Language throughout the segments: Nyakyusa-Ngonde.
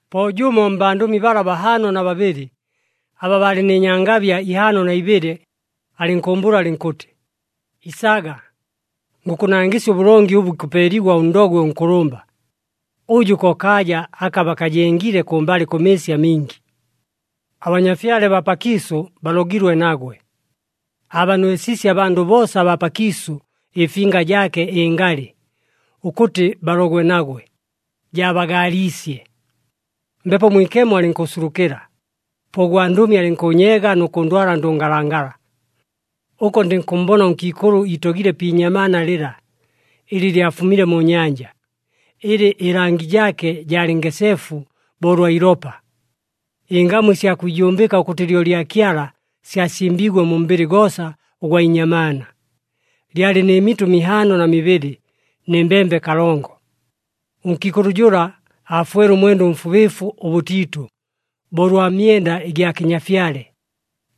Po jʉmo mbandʉmi bala bahaano na babɨlɨ, aba baalɨ nɨ nyangabya ihaano na ibɨlɨ alɨnkʉʉmbʉʉla alɨnkʉtɨ, “Isaga, ngʉkʉnangɨsya ʉbʉlongi ʉbʉ ikʉpeeligwa ʉndogwe ʉnkʉlʉmba, ʉjʉ ko kaaja aka bakajengile kʉmbalɨ kʉ mɨɨsi amingi. Abanyafyale baa pakiisʉ balogilwe nagwe. Aabanwesiisye abandʉ boosa abaa pakiisʉ ɨfinga jaake ɨngalɨ ʉkʉtɨ balogwe nagwe, jaabagaaliisye.” Mbepo Mwikemo alɨnkʉʉsulukɨla, po ʉgwandʉmi alɨnkʉʉnyeega nʉ kʉndwala ndʉngalangala. Ʉko ndɨnkʉmmbona ʉnkiikʉlʉ iitogile pi inyamaana lɨla ɨlɨ lyafumile mu nyanja, ɨlɨ ɨlangi jaake jaalɨ ngeseefu bo ʉlwa ilopa. Ɨngamu ɨsya kwijumbɨka ʉkʉtɨ lyo lya Kyala syasimbiigwe mu mbɨlɨ goosa ʉgwa inyamaana. Lyalɨ nɨ mitʉ mihaano na mibɨlɨ nɨ mbembe kalongo. Ʉnkiikʉlʉ jʉla aafwele ʉmwenda ʉmfubɨɨfu ʉbʉtiitʉ bo ʉlwa myenda ɨgya kɨnyafyale,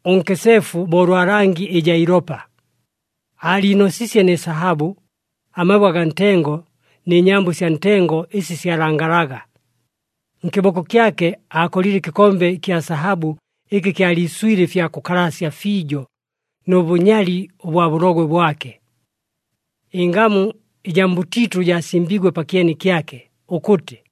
ʉnkeseefu bo ʉlwa langi ɨjaa ilopa. Aaliinosiisye nɨ sahabʉ, amabwe agaa ntengo nɨ nyambo ɨsya ntengo ɨsi syalangalaga. Nkɨboko kyake aakolile ɨkɨkombe ɨkya sahabʉ ɨkɨ kyaliiswile ɨfya kʉkalasya fiijo nʉ bʉnyali ʉbwa bʉlogwe bwake. Ɨngamu ɨjaa mbʉtiitʉ jaasimbiigwe pakyeni kyake, ʉkʉtɨ,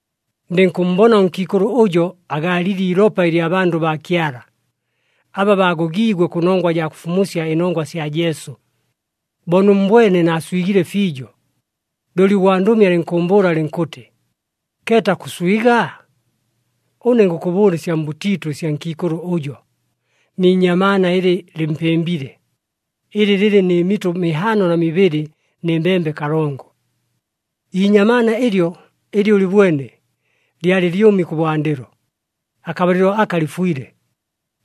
Ndɨnkʉmmbona ʉnkiikʉlʉ ʉjo agaalile iilopa ɨlya bandʉ baa Kyala, aba baagogiigwe kʉnongwa jaa kʉfumusya ɨnongwa sya Jesu. Bo nʉmmbwene naaswigile fiijo. Looli ʉgwandʉmi alɨnkʉʉmbʉʉla alɨnkʉtɨ, “Keeta kʉswiga? Ʉne ngʉkʉbʉʉla ɨsya mbʉtiitʉ ɨsya nkiikʉlʉ ʉjo, ni inyamaana ɨlɨ lɨmpɨmbile, ɨlɨ lɨlɨ nɨ mitʉ mihaano na mibɨlɨ nɨ mbembe kalongo. Iinyamaana ɨlyo, ɨlɨ ʉlɨbwene, lyalɨ lyʉmi kʉbwandɨlo, akabalɨlo aka lɨfwile,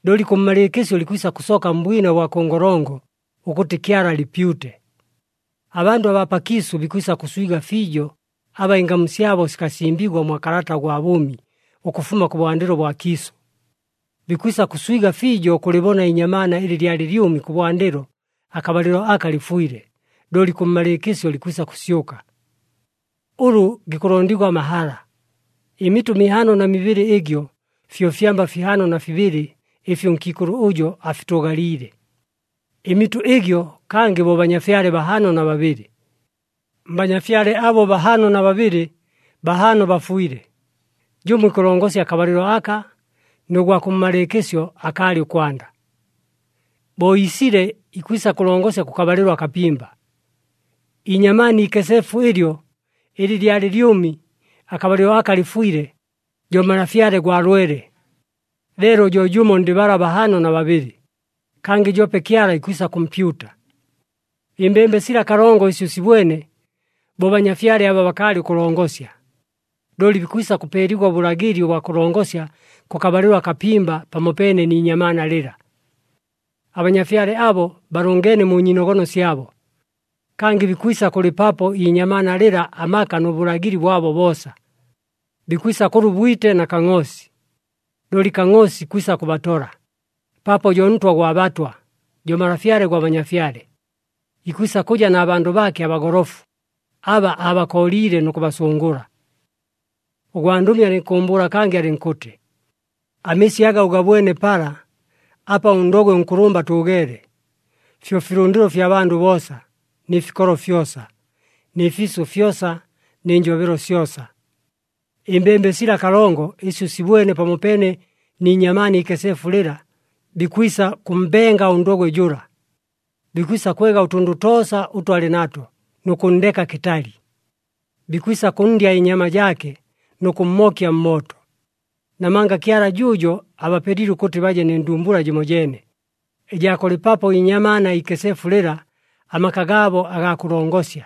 looli kʉmmalɨɨkɨsyo likwisa kʉsooka mbwina ʉbwa kʉ ngolongo ʉkʉtɨ Kyala alɨpyute. Abandʉ abaa pakiisʉ bikwisa kʉswiga fiijo, aba ɨngamu syabo sikasimbigwa mwa kalata ʉgwa bʉʉmi ʉkʉfuma kʉbwandɨlo bwa kiisʉ. Bikwisa kʉswiga fiijo ʉkʉlɨbona iinyamaana ɨlɨ lyalɨ lyʉmi kʉbwandɨlo, akabalɨlo aka lɨfwile, looli kʉmmalɨɨkɨsyo likwisa kʉsyʉka. “Ʉlʉ gikʉlondigwa amahala! Ɨmitʉ mihaano na mibɨlɨ ɨgyo, fyo fyamba fihaano na fibɨlɨ ɨfi ʉnkiikʉlʉ ʉjo afitʉʉgaliile. Ɨmitʉ ɨgyo kangɨ bo banyafyale bahaano na babɨlɨ. Mbanyafyale abo bahaano na babɨlɨ, bahaano bafwile, jʉmo ikʉlongosya akabalɨlo aka, nʉ gwa kʉmmalɨɨkɨsyo akaalɨ ʉkwanda. Bo iisile ikwisa kʉlongosya kʉkabalɨlo akapimba. Iinyamaana iikeseefu ɨlyo, ɨlɨ lyalɨ lyʉmi, akabalɨlo aka lɨfwile, jo malafyale gwa lwele. Leelo jo jʉmo ndɨ bala bahaano na babɨlɨ, kangɨ joope Kyala ikwisa kʉmpyuta. Ɨmbembe sila kalongo ɨsi ʉsibwene, bo banyafyale aba bakaalɨ ʉkʉlongosya. Looli bikwisa kʉpeeligwa ʉbʉlagɨli ʉbwa kʉlongosya kʉkabalɨlo akapimba pamopeene ni inyamaana lɨla. Abanyafyale abo balʉngeene mu nyiinogono syabo. Kangɨ bikwisa kʉlɨpapo iinyamaana lɨla amaka nʉ bʉlagɨli bwabo boosa. Bikwisa kʉlwa ʉbwite na Kangʼoosi. Looli Kangʼoosi ikwisa kʉbatola, paapo jo Ntwa gwa batwa, jo Malafyale gwa banyafyale. Ikwisa kʉja na bandʉ baake abagolofu, aba aabakooliile nʉ kʉbasʉngʉla.” Ʉgwandʉmi alɨnkʉʉmbʉʉla kangɨ, alɨnkʉtɨ, “Amɨɨsi aga ʉgabwene pala, apa ʉndogwe ʉnkʉlʉmba atʉʉgeele, fyo filʉndɨlo fya bandʉ boosa, nɨ fikolo fyosa, nɨ fiisʉ fyosa, nɨ njobelo syosa. Ɨmbembe sila kalongo ɨsi ʉsibwene pamopeene ni inyamaana iikeseefu lɨla, bikwisa kʉmmbenga ʉndogwe jʉla. Bikwisa kwega ʉtʉndʉ toosa ʉtʉ alɨ nato nʉ kʉnndeka kɨtali. Bikwisa kʉnndya ɨnyama jaake nʉ kʉmmookya mmooto. Namanga Kyala jʉʉjo abapelile ʉkʉtɨ baje nɨ ndumbula jɨmojeene, ɨjaa kʉlɨpapo iinyamaana iikeseefu lɨla, amaka gaabo agaa kʉlongosya.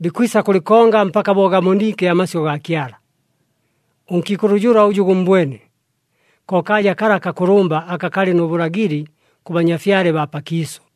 Bikwisa kʉlɨkonga mpaka bo gaboniike amasyʉ gaa Kyala. Ʉnkiikʉlʉ jʉla ʉjʉ gʉmmbwene, ko kaaja kala akakʉlʉmba aka kalɨ nʉ bʉlagɨli kʉ banyafyale baa pakiisʉ.”